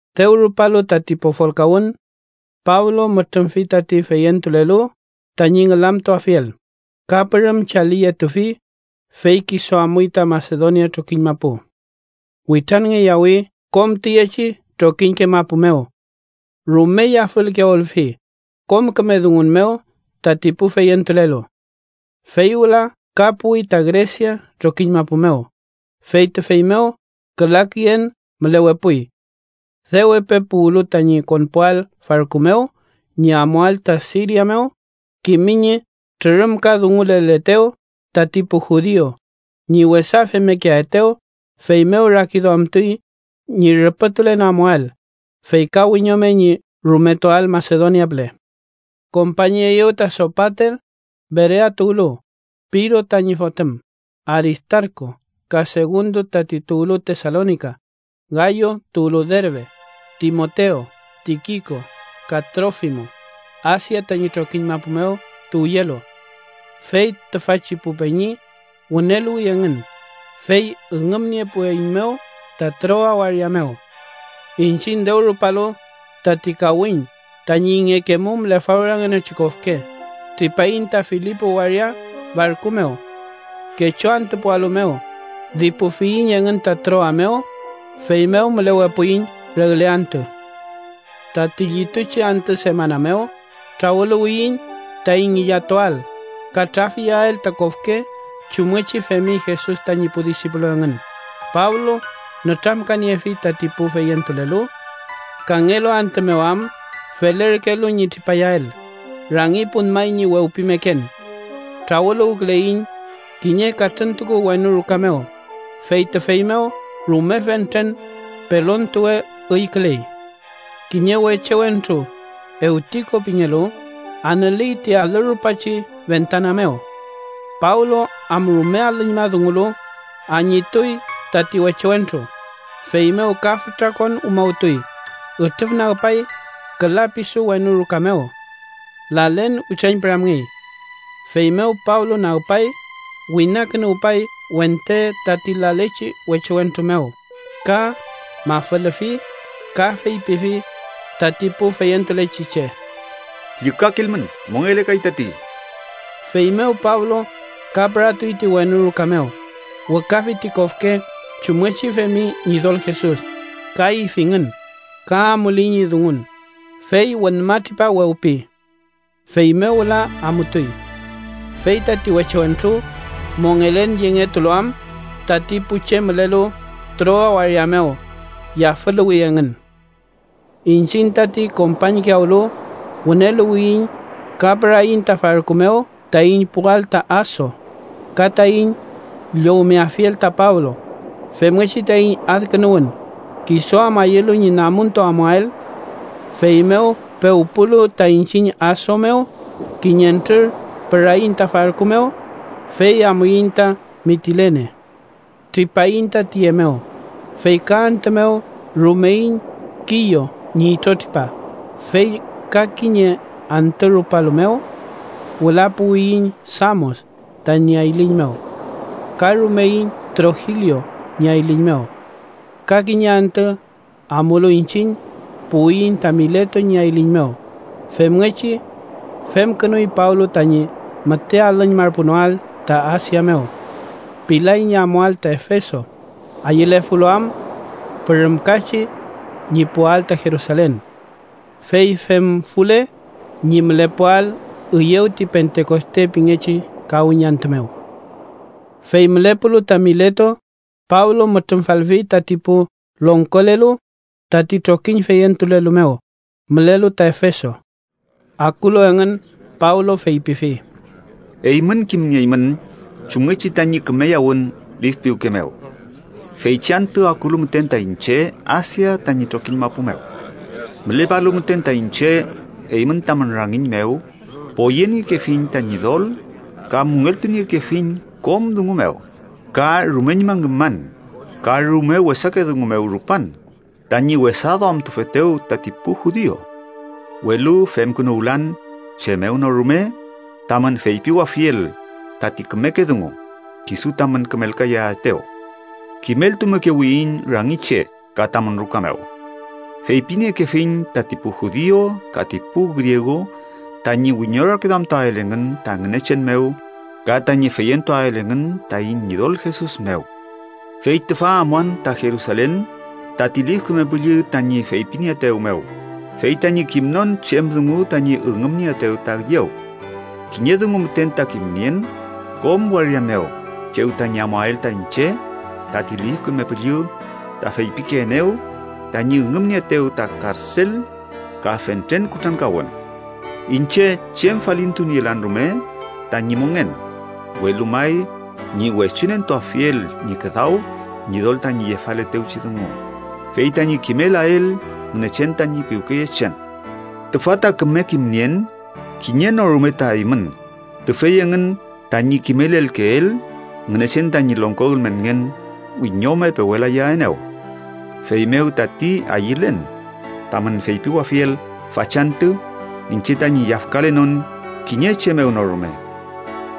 Dew rupalu tati pofolkawün, Pablo mütrümfi tati feyentulelu tañi ngülamtuafiel, ka pürüm chaliyetufi, fey kisu amuy ta Masedonia trokiñ mapu. Witranngeyawi kom tiyechi trokiñke mapu mew. Rume yafülkiyawülfi kom küme dungun mew tati pu feyentulelu. Fey wüla ka puwi ta Gresia trokiñ mapu mew, fey tüfey mew küla küyen mülewepuy. Dew epe puwlu tañi konpuael farku mew ñi amuael ta Siria mew, kimi ñi trürümkadunguleletew tati pu judiu ñi wesa femmekeaetew. Feymew rakiduamtuy ñi rüpütulen amuael, fey ka wiñome ñi rumetuael Masedonia püle. Kompañeyew ta Sopater, Berea tuwlu, Piro tañi fotüm; Aristarku ka Segundo tati tuwlu Tesalonika, Gayo tuwlu Derbe, Timotew, Tikiko ka Trofimo, Asia tañi trokiñ mapu mew tuwyelu. Fey tüfachi pu peñi wüneluwi engün, fey üngümniepueiñmew ta Troa waria mew. Iñchiñ, dew rupalu tati kawiñ tañi ingekemum lefawrangenochi kofke, tripaiñ ta Filipo waria farku mew. Kechu antüpualu mew, dipufiyiñ engün ta Troa mew, feymew mülewepuiñ regle antü. Tati llituchi antü semana mew trawüluwiyiñ taiñ ngillatuael ka traf iyael ta kofke chumngechi femi Jesus tañi pu disipulu engün, Pablo nütramkaniefi tati pu feyentulelu. Kangelu antü mew am felerkelu ñi tripayael, rangi punmay ñi wewpimeken. Trawüluwküleiñ kiñe katrüntuku wenu ruka mew, fey tüfey mew rume fentren pelontuwe üyküley. Kiñe weche wentru, Ewtiko pingelu, anüley ti alü rupachi fentana mew. Pablo am rume alüñma dungulu, añituy tati weche wentru, feymew ka fütra kon umawtuy, ütrüfnagpay küla pisu wenu ruka mew. Lalen witrañpüramngey. Feymew Pablo nagpay, winakünuwpay wente tati lalechi weche wentru mew ka mafülüfi. Ka feypifi tati pu feyentulechi che: —¡Llükakilmün! Mongelekay tati. Feymew Pablo ka püratuy ti wenu ruka mew, wükafi ti kofke chumngechi femi Ñidol Jesus, ka ifingün, ka amuley ñi dungun, fey wünmatripa wewpi. Feymew wüla amutuy. Fey tati weche wentru, mongelen yengetulu am, tati pu che mülelu Troa waria mew yafüluwi engün. Iñchiñ tati kompañkiyawlu wüneluwiyiñ ka püraiñ ta farku mew taiñ puwael ta Aso ka taiñ llowmeafiel ta Pablo, femngechi taiñ adkünuwün, kisu am ayülu ñi namuntu amuael. Feymew pewpulu ta iñchiñ Aso mew, kiñentrür püraiñ ta farku mew, fey amuiñ ta Mitilene. Tripaiñ ta tüye mew, fey ka antü mew rumeiñ Kiyo ñi itrotripa, fey ka kiñe antü rupalu mew wüla puwiyiñ Samos tañi ayliñ mew. Ka rumeiñ Trogilio ñi ayliñ mew. Ka kiñe antü amulu iñchiñ, puwiyiñ ta Mileto ñi ayliñ mew. Femngechi femkünuy Pablo tañi müte alüñmarpunoael ta Asia mew. Pilay ñi amuael ta Efeso, ayülefulu am pürümkachi ñi puwael ta Jerusalen. Fey femfule, ñi mülepuael üyew ti Pentekoste pingechi kawiñ antü mew. Fey mülepulu ta Mileto, Pablo mütrümfalfi tati pu longkolelu tati trokiñ feyentulelu mew mülelu ta Efeso. Akulu engün Pablo feypifi: “Eymün kimnieymün chumngechi tañi kümeyawün lif piwke mew feychi antü akulu müten ta iñche Asia tañi trokiñ mapu mew. Mülepalu müten ta iñche eymün tamün rangiñ mew, poyeniekefiñ ta Ñidol ka müngeltuniekefiñ kom dungu mew, ka rumeñma ngüman ka rume wesake dungu mew rupan tañi wesaduamtufetew tati pu judiu. Welu femkünuwlan chem mew no rume tamün feypiwafiel tati kümeke dungu kisu tamün kümelkayaetew. Kimeltumekewiyiñ rangi che ka tamün ruka mew. Feypiniekefiñ tati pu judiu ka ti pu griegu tañi wiñorakiduamtuael engün ta Ngünechen mew ka tañi feyentuael engün taiñ Ñidol Jesus mew. “Fey tüfa amuan ta Jerusalen tati Lif Küme Püllü tañi feypinieetew mew, fey tañi kimnon chem dungu tañi üngümnieetew ta üyew. Kiñe dungu müten ta kimnien, kom waria mew chew tañi amuael ta iñche, tati Lif Küme Püllü ta feypikeenew tañi üngümnieetew ta karsel ka fentren kutrankawün. Iñche chem falintunielan rume tañi mongen, welu may ñi wechunentuafiel ñi küdaw Ñidol tañi yefaletewchi dungu, fey tañi kimelael Ngünechen tañi piwkeyechen. “Tüfa ta küme kimnien kiñe no rume ta eymün, tüfey engün tañi kimelelkeel Ngünechen tañi longko ülmenngen wiñome pewelayaenew. Feymew tati ayülen tamün feypiwafiel fachantü iñche tañi yafkalenon kiñe che mew no rume.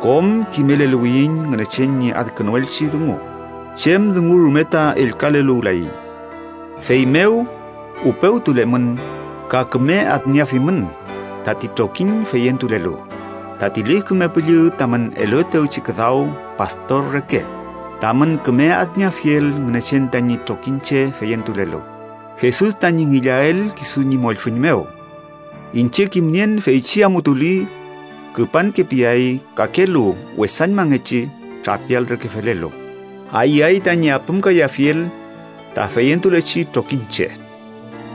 Kom kimeleluwiyiñ Ngünechen ñi adkünuelchi dungu, chem dungu rume ta ellkaleluwlayiñ. Feymew upewtulemün ka küme adnieafimün tati trokiñ feyentulelu, tati Lif Küme Püllü tamün eluetewchi küdaw pastor reke, tamün küme adnieafiel Ngünechen tañi trokiñche feyentulelu, Jesus tañi ngillael kisu ñi mollfüñ mew. Iñche kimnien feychi amutuli küpankepiay kakelu wesañmangechi trapial reke felelu, ayüay tañi apümkayafiel ta feyentuleyechi trokiñche.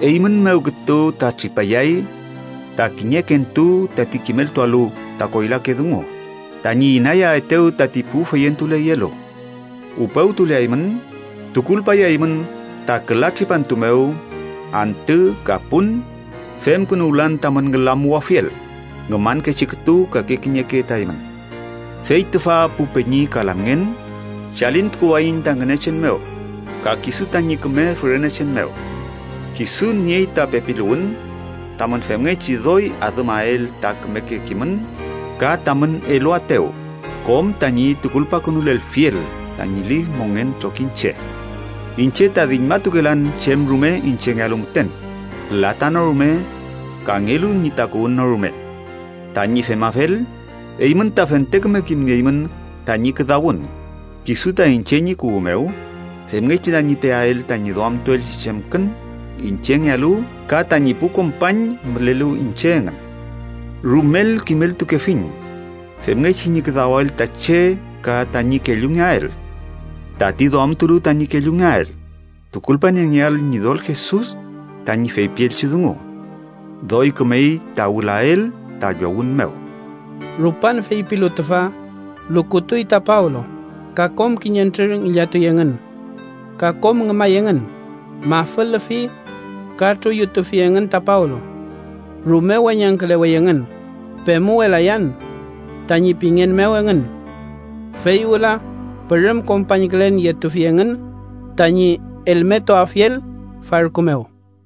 Eymün mew kütu ta tripayay ta kiñekentu tati kimeltualu ta koylake dungu tañi inayaetew tati pu feyentuleyelu. Upewtuleaymün, tukulpayaymün ta küla tripantu mew, antü ka pun, femkünuwlan tamün ngülamuwafiel ngümankechi kütu kake kiñeke ta eymün. “Fey tüfa, pu peñi ka lamngen, chalintukuwayiñ ta Ngünechen mew ka kisu tañi küme fürenechen mew. Kisu niey ta pepiluwün tamün femngechi doy adümael ta kümeke kimün ka tamün eluaetew kom tañi tukulpakünulelfiel tañi lif mongen trokiñche. Iñche ta diñmatukelan chem rume iñchengealu müten, pülata no rume kangelu ñi takuwün no rume. Tañi femafel, eymün ta fente küme kimnieymün tañi küdawün kisu ta iñche ñi kuwü mew femngechi tañi peael tañi duamtuelchi chemkün iñchengealu ka tañi pu kompañ mülelu iñche engün. Rumel kimeltukefiñ femngechi ñi küdawael ta che ka tañi kellungeael tati duamtulu tañi kellungeael, tukulpaniengeael Ñidol Jesus tañi feypielchi dungu: ‘doy kümey ta wülael ta llowün mew.’” Rupan feypilu tüfa, lukutuy ta Pablo ka kom kiñentrür ngillatuy engün. Ka kom ngümay engün, mafülüfi ka truyutufi engün ta Pablo. Rume weñangkülewey engün, “pemuwelayan” tañi pingen mew engün. Fey wüla pürüm kompañkülen yetufi engün tañi elmetuafiel farku mew.